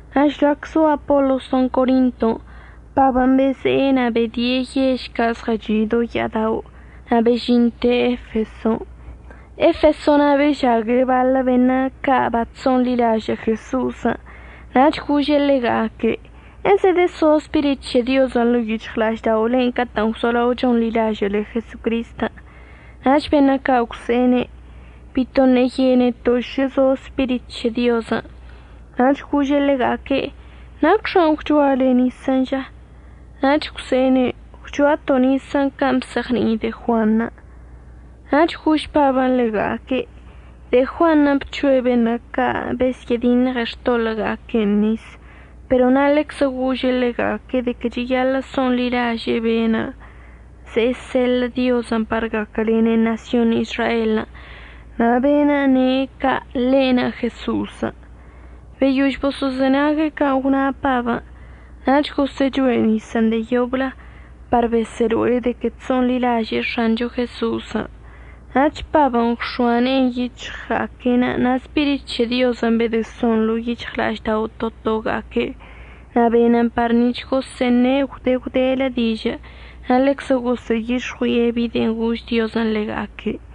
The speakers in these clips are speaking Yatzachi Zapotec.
Na' žlac zo Apolosən' Corinton', Pabən' beze'e na' bedie' yež ca' zɉəchi' do ya'ada'onə' na' bežinte' Efeson'. Efeso na' bežague' baḻə beṉə' ca' bachso'onḻilažə' Jeso'osən'. Nach gože' ḻega'aque': ―¿Ezedəso Spirit c̱he Diozən' ḻo'o yic̱hɉla'ažda'olen' catə'ən gwzolao chonḻilažə'əle Jesocristən'? Nach beṉə' ca' gwse'ene': ―Bito ṉe'e yeneto' šə zo Spirit c̱he Diozən'. Nach goze'e ḻega'aque': ―¿Nacxan' gwchoale nisən' ža? Nach gwse'ene': ―Gwchoato' nisən' can' bzeɉni'i de'e Juanṉə'. Nach gož Pabən' ḻega'aque': ―De'e Juanṉə' bc̱hoe' beṉə' ca' besyə'ədiṉɉe xtoḻə'əga'aque'enə' nis pero na' ḻeczə gože' ḻega'aque' de que cheyaḻə' so'onḻilaže'e be'enə' ze'e seḻə' Diozən' par gaquəlene' ṉasyon Izraelən', na' be'enə' ne' ca' ḻe'enə' Jeso'osən'. Beyož boso'ozenague' can' gwna Pabən' nach gosə'əchoe' nisən' de'e yoblə par besə'əlo'e de que chso'onḻilaže'e X̱ancho Jeso'osən'. Nach Pabən' gwx̱oa ne'enə' yic̱hɉga'aque'enə' na' Spirit c̱he Diozən' bedəson ḻo'o yic̱hɉla'aždao' to toga'aque' na' benən par nic̱h gosə'əṉe' gwde gwdelə dižə' na' ḻeczə gosə'əyix̱ɉui'e bi de'en gož Diozən' ḻega'aque'.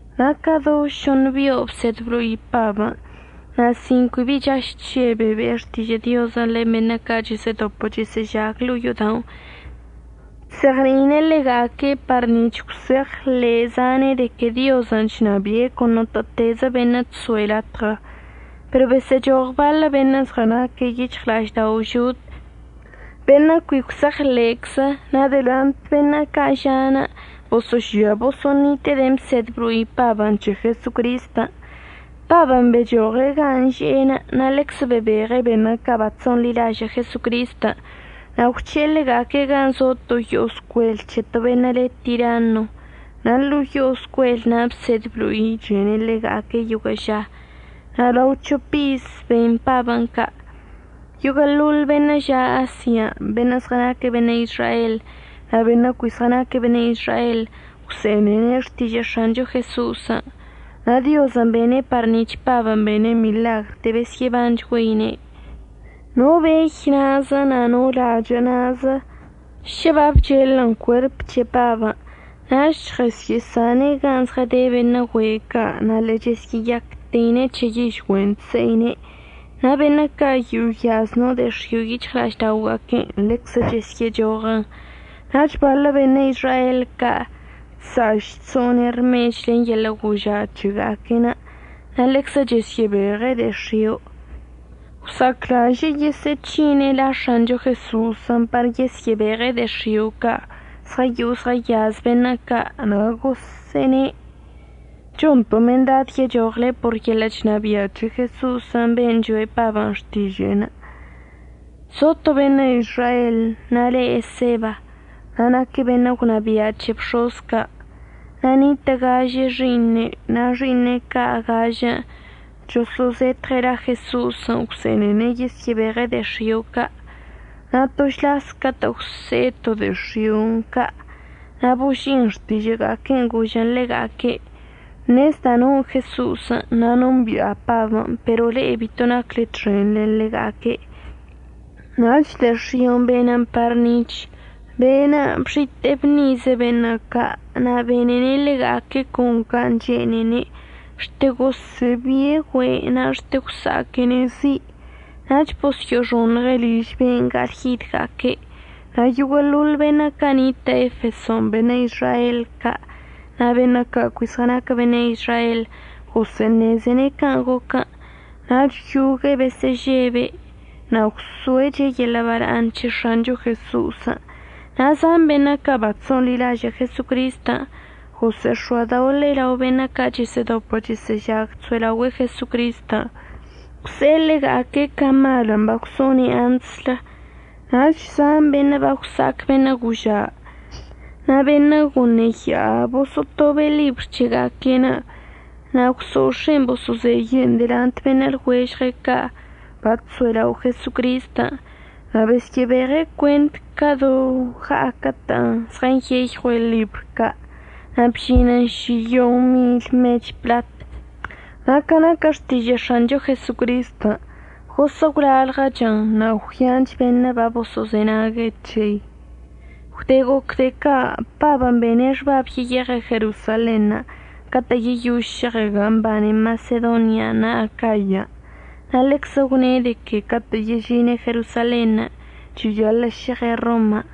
Na' ca do šoṉ bio' bsed blo'i Pabən', na' sin cui chaž chžebe' be'e xtižə' Diozən' len beṉə' ca' chəsə'ədopə chəsə'əžag ḻo'o yo'oda'onə' chzeɉni'ine' ḻega'aque' par nic̱h gwse'eɉḻe' zane' de que Diozən' chnabi'e con notə'ətezə beṉə' chso'e latɉə. Pero besə'əchoɉ baḻə beṉə' zɉənaquə yic̱hɉla'aždao' žod beṉə' cui gwse'eɉḻe'eczə na' delant beṉə' ca' ža'anə' boso'ožia boso'onite'e de'en əbsed əblo'i Pabən' c̱he Jesocristən'. Pabən' bechoɉe' gan' že'enə' na' ḻeczə bebeɉe' beṉə' ca' bachso'onḻilažə' Jesocristən', na' gwc̱he'e ḻega'aque' gan' zo to yo'o scuel c̱he to beṉə' le Tiranno na' ḻo'o yo'o scuelən' bsed əblo'ichene' ḻega'aque' yoguə' ža. Na' lao c̱hop iz ben Pabən' ca', yoguə'əḻoḻ beṉə' ža' Asian' beṉə' zɉənaquə beṉə' Izrael na' beṉə' cui zɉənaquə beṉə' Izrael gwse'enene' xtižə' X̱ancho Jeso'osən'. Na' Diozən' bene' par nic̱h Pabən' bene' miḻagr de'e besyə'əbanchgüeine'. No bey na'azə na' no lachə' na'azə šə babchelən cuerp c̱he Pabən' nach chɉəsyə'əsane'en gan' zɉəde beṉə' güe' ca' na' ḻe'e chəsyə'əyacteine' c̱he yižgüe'en chse'ine', na' beṉə' ca' yo'o yaz no de'e x̱io' yic̱hɉla'ažda'oga'aque'enə' ḻeczə chesyə'əchoɉən. Nach baḻə beṉə' Izrael ca' beṉə' ca' chsa'aš chso'one' rmech len yeḻə' goža' c̱hega'aque'enə' na' ḻeczə chəsyə'əbeɉe' de'e x̱io', gwsa'aclaže'e yesə'əc̱hine' la X̱ancho Jeso'osən' par yesyə'əbeɉe' de'e x̱io' ca' zɉəyo'o zɉəyaz beṉə' ca' na' gosə'əne': “Chonto' mendad yechoɉle por yeḻə' chnabia' c̱he Jeso'osən' ben' choe' Pabən' xtiže'enə'.” Zo to beṉə' Izrael na' le Eseba na' naque' beṉə' gwnabia' c̱he bx̱oz ca'. Na' nitə' gažə xi'iṉe' na' xi'iṉe' ca' gažən' choso'ozetɉe' la Jeso'osən' gwse'enene' yesyə'əbeɉe' de'e x̱io' ca'. Na' to šlas catə' gwse'e to de'e x̱io'on ca' na' boži'in xtižə'əga'aque'enə' gožən ḻega'aque': ―Ṉezda' non' Jeso'osən' na' nombi'a Pabən', pero le'e bito nacle txen len ḻega'aque'. Nach de'e x̱io'onə' benən par nic̱h be'enə' bxite'e bṉize' beṉə' ca' na' benene' ḻega'aque' con can' chene'enṉə', xte gosə'əbi'e güe' na' xte gwsa'aquene' zi', nach bosyo'oxoṉɉe' liž be'enə' ga'alyidga'aque'. Na' yoguə'əḻoḻ beṉə' ca' nitə' Efeson' beṉə' Izrael ca' na' beṉə' ca' cui zɉənaquə beṉə' Izrael gosə'əṉezene' can' goquən'. Nach yogue'e besə'əžebe' na' gwso'eche' yeḻə' bala'aṉ c̱he X̱ancho Jeso'osən'. Na' zan beṉə' ca' bachso'onḻilažə' Jesocristən' gosə'əx̱oadoḻe'e lao beṉə' ca' chəsə'ədopə chəsə'əžag chso'elaogüe'e Jesocristən' gwse'e ḻega'aque' ca malən' bagwso'one' antslə. Nach zan beṉə' bagwsa'ac beṉə' goža' na' beṉə' goṉe ya'a boso'otobe' ḻibr c̱hega'aque'enə' na' gwso'ox̱e'en boso'ozeye'en delant beṉə' lɉuežɉga'aque' ca' bachso'elao' Jesocristən', na' besyə'əbeɉe' cuent ca do ɉa'aquə'ətə' zɉənyeyɉue' ḻibr ca' na' bžinən šiyon mil mech pḻat. Na' ca naquə xtižə' X̱ancho Jesocristən' gosə' gwlalɉəchən' na' gwyanch beṉə' boso'ozenague' c̱hei. Gwde goc de'e ca' Pabən' bene' xbab yeyeɉe' Jerosalenṉə' catə' yeyož šeɉe' gan' mbane Masedonian' na' Acayan'. Na' ḻeczə gwne' de que catə' yežine' Jerosalenṉə' cheyaḻə' šeɉe' Roman'.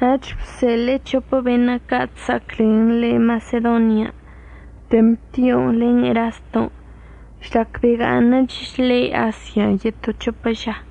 Nach bseḻe'e c̱hopə beṉə' ca' chsa'aclen ḻe' Masedonian', Temtion' len Eraston', žlac bega'aṉəch ḻe' Asian' yeto c̱hopə ža.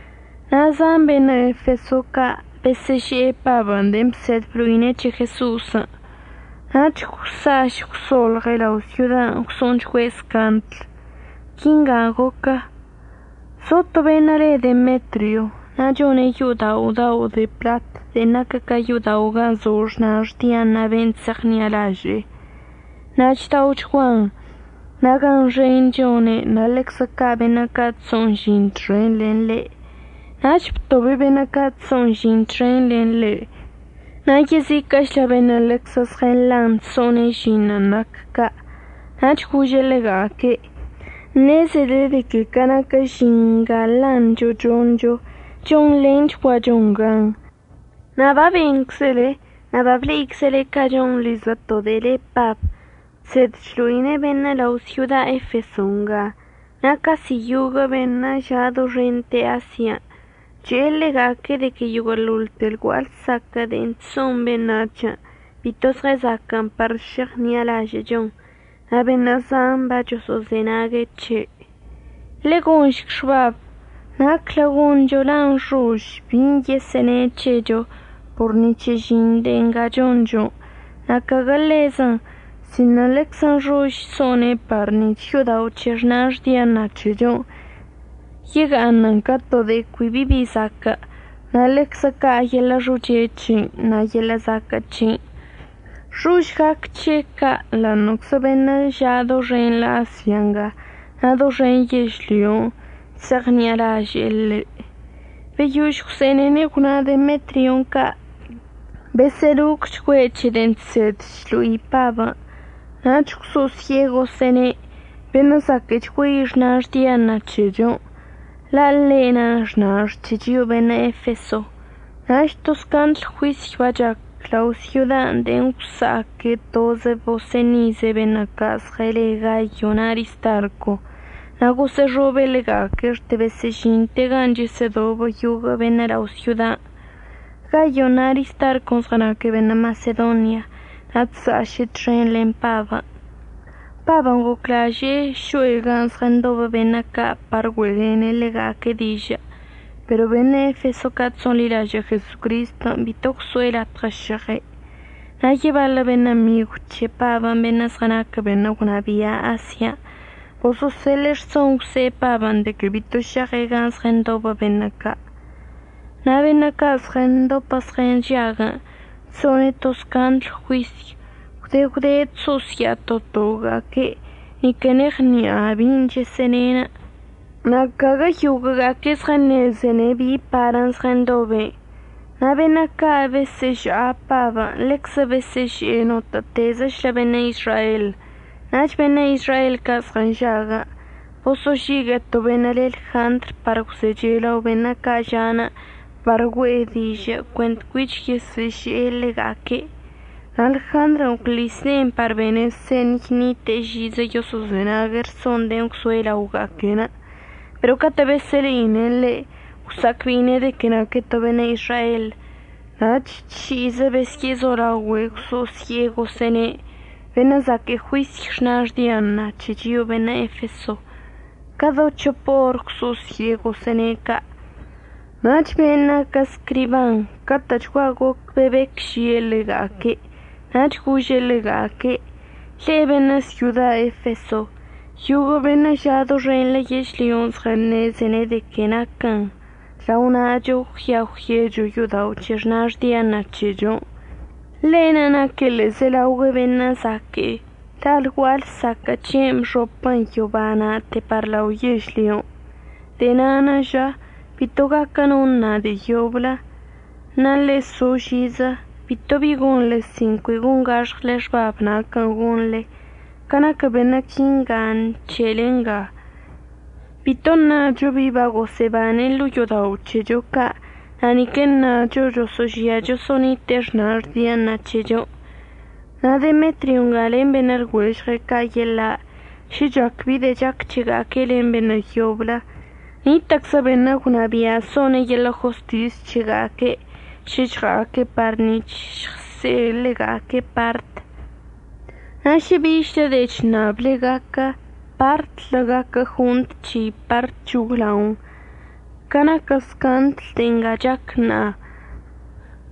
Na' zan beṉə' Efeso ca' besə'əže'e Pabən' de'en bsed əblo'ine' c̱he Jeso'osən', nach gwsa'aš gwso'olɉe' lao' syodan' gwso'onchgüe' scandl. Quingan' goquə. Zo to beṉə' le Demetrio na' chone' yo'odao' dao' de pḻat de'en naquə ca yo'odao' gan' zo xnax Diana ben' chse'eɉṉi'alaže'e, na' chda'ochguan na' gan xen chone' na' ḻeczə ca' beṉə' ca' chso'on žin txen len ḻe'. Nach btobe' beṉə' ca' chso'on žin txen len ḻe' na' yeziquə'əchlə beṉə' ḻeczə zɉənḻan chso'on žinṉə' nac ca' nach gože' ḻega'aque': ―Ṉezele de que ca naquə žin nga nḻancho choncho, chonḻenchguachon gan. Na' babenczele na' bable'iczele can' chonḻizə to de'e le Pab chsed chlo'ine' beṉə' lao' syoda Efeso nga na' casi yoguə' beṉə' ža' doxente Asian' che'e ḻega'aque' de que yoguə'əḻoḻte lgua'a lsaquə' de'e chso'on beṉac̱hən' bito zɉəzaquə'ən par šeɉṉi'alažə'əchon. Na' beṉə' zan bachoso'ozenag c̱he'. Ḻe'e gonšc xbab naclə goncho la' nxož bin' yesə'əne' c̱hecho por ni c̱he žin de'e nga choncho, na' caguə ḻezən, sino ḻeczə nxož so'one' par nic̱h yo'odao' c̱he xnax Diana c̱hechon' yega'aṉən ca to de'e cui bi bi zaque'e na' ḻeczə ca' yeḻə' xoche c̱he'enə' na' yeḻə' zaquə' c̱he'enə'. Xož gac c̱he' ca' ḻa'aṉə'əczə beṉə' ža' doxenḻə Asia nga na' doxen yežlyon' chse'eɉṉi'alaže'e ḻe'. Beyož gwse'enene' gwna Demetrion' ca' besə'əlocchgüe' c̱he de'en chsed chlo'i Pabən', nach gwso'osye'e gosə'əne': ―Beṉə' zaquə'əchgüei xnax Diana c̱hechon', la' ḻe'enə' xnax c̱he chio'o beṉə' Efeso. Nach to scandl juisy bachac lao' syodan' de'en gwsa'aque' tozə bosə'əṉize' beṉə' ca' zɉəle Gayo na' Aristarco, na' gosə'əxobe' ḻega'aque' xte besə'əžinte' gan' chəsə'ədobə yoguə' beṉə' lao' syodan'. Gayon' na' Aristarcon' zɉənaque' beṉə' Masedonia na' chsa'aše' txen len Pabən'. Pabən' goclaže'e šo'e gan' zɉəndobə beṉə' ca' par güe'elene' ḻega'aque' dižə' pero beṉə' Efeso ca' chso'onḻilažə' Jesocristən' bito gwso'e latɉə šeɉe'. Na' yebaḻə beṉə' migw c̱he Pabən', beṉə' zɉənaquə beṉə' gwnabia' Asian', boso'oseḻe'e rson gwse'e Pabən' de que bito šeɉe' gan' zɉəndobə beṉə' ca'. Na' beṉə' ca' zɉəndopə zɉənžaguən' chso'one' to scandl juisy. Gwde gwde chso'osya'a to toga'aque', nique neɉni'a bin' chəsə'əne'. Na' caguə yoguə'əga'aque' zɉəṉezene' bi parən' zɉəndobe'. Na' beṉə' ca' besə'əža'a Pabən' ḻeczə besə'əže'e notə'ətezəchlə beṉə' Izrael. Nach beṉə' Izrael ca' zɉənžaguən' boso'ožigue'e to beṉə' le Ljandr par gwzeche' lao beṉə' ca' ža'anə' par güe'e dižə' cuent cuich yesə'əže'e ḻega'aque'. Na' Ljandrən' gwḻis ne'enə' par bene' señy ṉite'e žizə yoso'ozenague' rsonṉə' de'en gwzoe' laoga'aque'enə'. Pero catə' besə'əle'ine' ḻe' gwsa'acbe'ine' de que naque' to beṉə' Izrael, nach tši'izə besyə'əzolaogüe' gwso'osye'e gosə'əne': ―Beṉə' zaquə' juisy xnax Diana c̱he chio'o beṉə' Efeso. Ca do c̱hop or gwso'osye'e gosə'əne' ca'. Nach be'enə' naquə scriban catə'əchgua goc bebec žie' ḻega'aque' nach gože' ḻega'aque': ―Le'e beṉə' syoda Efeso, yoguə' beṉə' ža' doxenḻə yežlyon' zɉəṉezene' de que naquən lao na'acho əggüia əgwyecho yo'odao' c̱he xnax Diana c̱hechon'. Ḻe'enə' naque' ḻe'ezelaogüe beṉə' zaque'e la' lgua'a lsaquə' c̱he'enə' bxopən yoba na'ate par lao yežlyon'. De'e na'anə' ža bito gaquə no əṉa de'e yoblə. Na' ḻe'e so žizə, bito bi gonḻe sin cui gongax̱ɉle xbab naquən' gonḻe. Ca naquə beṉə' quinga nc̱he'ele nga, bito əṉacho bi bagosə'əbane' ḻo'o yo'odao' c̱hecho ca' na' nique əṉacho choso'ožia choso'onite'e xnax Diana c̱hechon'. Na' Demetrion' nga len beṉə' lɉuežɉe' ca' yeḻa', šə chac bi de'e chac c̱hega'aque' len beṉə' yoblə, nitə'əczə beṉə' gwnabia' so'one' yeḻə' jostis c̱hega'aque'enə' šə žɉa'aque' par nic̱h əžɉse'e ḻega'aque' part. Na' šə bichlə de'e chṉable gaquə, partlə gaquə jont c̱hei par c̱hoglaon. Ca naquə scandl de'e nga chac ṉa'a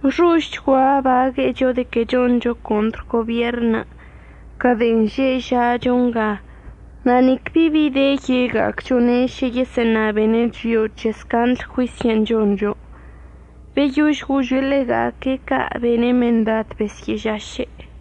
nxožchgua əbague'echo de que choncho contr gobierṉ ca de'en nga že'e ža'acho nga, na' nic bi bi de ye'ega'acchone' šə yesə'əṉabene' chio'o c̱he scandl juisyən' choncho. Beyož gože' ḻega'aque' ca' bene' mendad besyə'əžaše'.